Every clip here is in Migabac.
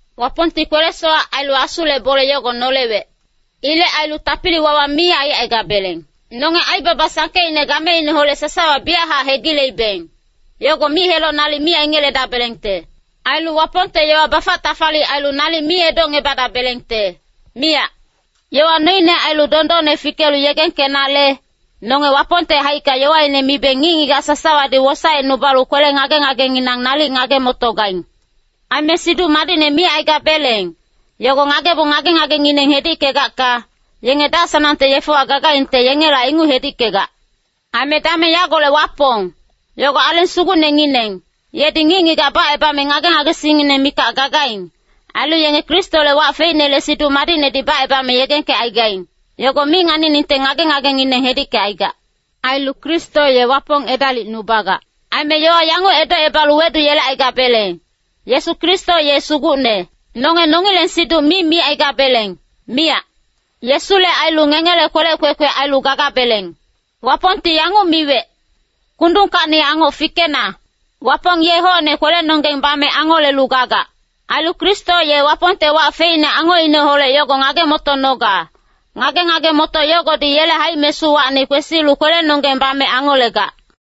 Wapongti kwele-sowac ailu Asule bole yogo nolewec. Ilec ailu tapili-wawa mi aicaigabeleng. Nonge aibaba sangkeicne gameineholec sasawa biyachac hegileibeng, yogo mic-heloc nalic mi aingeledabelengte. Ailu Wapongte yowa bafac-tafalic ailu nalic mi edocngebadabelengte, miyac. Yowa noine ailu dondonne fikelu yegengkenale, nonge Wapongte haicka yowaine mibeng ngic-ngigac sasawadi wosaecnubalu kwele ngage-ngagenginang nalic ngage-motogaing. Aime Siduc Madicne micaigabeleng, yogo ngagebong ngage-ngagengineng hedickegacka, yenge dac-sanangte yefewa gagaingte, yengela inguc hedickegac. Aime dameng yagolec wapong, yogo Aleng Sugucnengineng, yedi ngic-ngigac bacebame ngage-ngagesingngineng mikac gagaing. Ailu yenge Kristole wac feicnele Siduc Madicnedi bacebame yegengkecaigaing, yogo mi nganiningte ngage-ngagengineng hedickecaigac. Ailu Kristo ye Wapong edalicnubagac. Aime yowa yanguc edocebalu weduyelecaigabeleng, Yesu Kristo ye Sugucne. Nonge nongileng siduc mi micaigabeleng, miyac. Yesule ailu ngengele kwelec kwekwe ailu gagabeleng. Wapongti yanguc miwec, “Kundungkacni angoc fikena.” Wapong ye hocne kwelenonggeng bame angolelu gagac. Ailu Kristo ye Wapongte wac feicne angocineholec yogo ngage-motonoga. Ngage-ngage-motoc yogodi yele haic-mesuwacni kwesilu kwelenonggeng bame angolegac.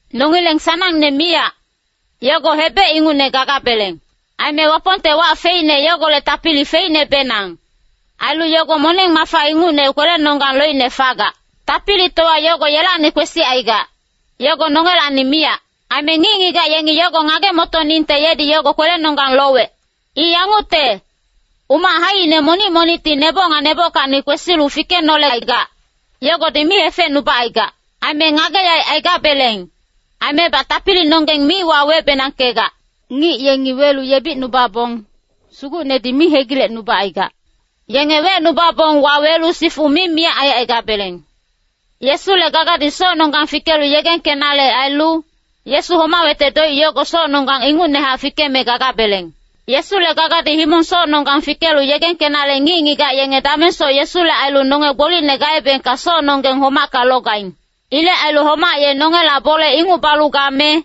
Nongileng sanangne miyac, yogo hebec ingucne gagabeleng. Aime Wapongte wac feicne yogolec tapili feicnebenang. Ailu yogo moneng-mafa ingucne kwelenonggang loicne fagac. Tapilitowa yogo yelacni kwesicaigac, yogo nongelacni miyac. Aime ngic-ngigac yengi yogo ngage-motoningte yedi yogo kwelenonggang lowec. I yangucte, umac haicine monic-monicti neboc nga nebockacni kwesilu fikenolecaigac, yogodi mi hefecnubacaigac. Aime ngage-yaec aigabeleng, aimebac tapilinonggeng mi wawebenangkegac. Ngic yengi welu yebicnubabong, Sugucnedi mi hegilecnubacaigac. Yenge wecnubabong wawelu sifu mi miyac aicaigabeleng. Yesule gagadi socnonggang fikelu yegengkenale ailu, Yesu homawecte doic yogo socnonggang ingucnehac fikeme gagabeleng. Yesule gagadi himong-socnonggang fikelu yegengkenale ngic-ngigac yenge damengsoc Yesule ailu nonge gbolicne gaebengka socnonggeng homacka logaing. Ilec ailu homac ye nongela bole inguc balu game,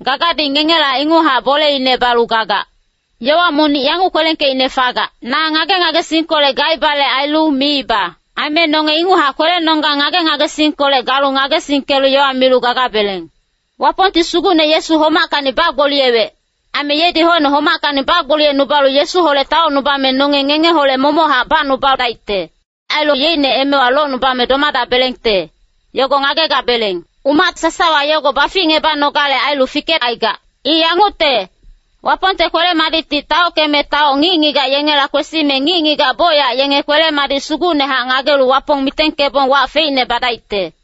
gagadi ngengela inguchac boleine balu gagac. Yowa monic yanguc kwelengkeicne fagac, “Na ngage-ngagesingkolec gaibale ailu miiba.” Aime nonge inguchac kwelenonggang ngage-ngagesingkolec galu ngagesingkelu yowa milu gagabeleng. Wapongti Sugucne Yesu homackacni bagboliyewec. Aime yedi hocne homackacni bagboliyecnubalu Yesuholec taocnubame nonge ngengeholec momochac bacnubadaicte. Ailu yeicne emewa locnubame domadabelengte, yogo ngagegabeleng. Umac sasawa yogo baficngebanogale ailu fikecaigac. I yangucte, Wapongte kwele-madicti taockeme taoc ngic-ngigac yengela kwesime ngic-ngigac bocyac yenge kwele-madic sugucnehac ngagelu Wapong mitengkebong wac feicne badaicte.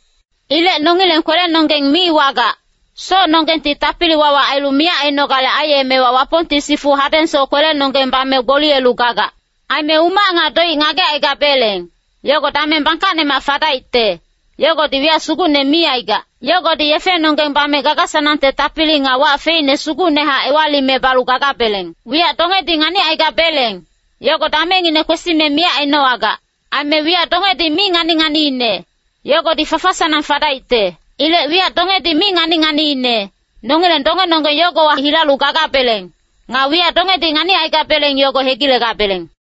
Ilec nongileng kwelenonggeng mi wagac. Socnonggengti tapili-wawa ailu miyac ainogale aiyemewa, Wapongti sifu hadengsoc kwelenonggeng bame gboliyelu gagac. Aime umac nga doic ngagecaigabeleng, yogo dameng bangkacnemac fadaicte, yogodi wiyac sugucne mi aigac. Yogodi yefenonggeng bame gaga-sanangte tapili nga wac feicne sugucnehac ewalime balu gagabeleng. Wiyac dongedi nganicaigabeleng, yogo damengngine kwesime miyac ainowagac. Aime wiyac dongedi mi ngani-nganiine, yogodi fafa-sanang fadaicte. Ilec wiyac dongedi mi ngani-nganiine, nongileng dongenonggeng yogowa hilalu gagabeleng. Nga wiyac dongedi nganicaigabeleng yogo hegilegabeleng.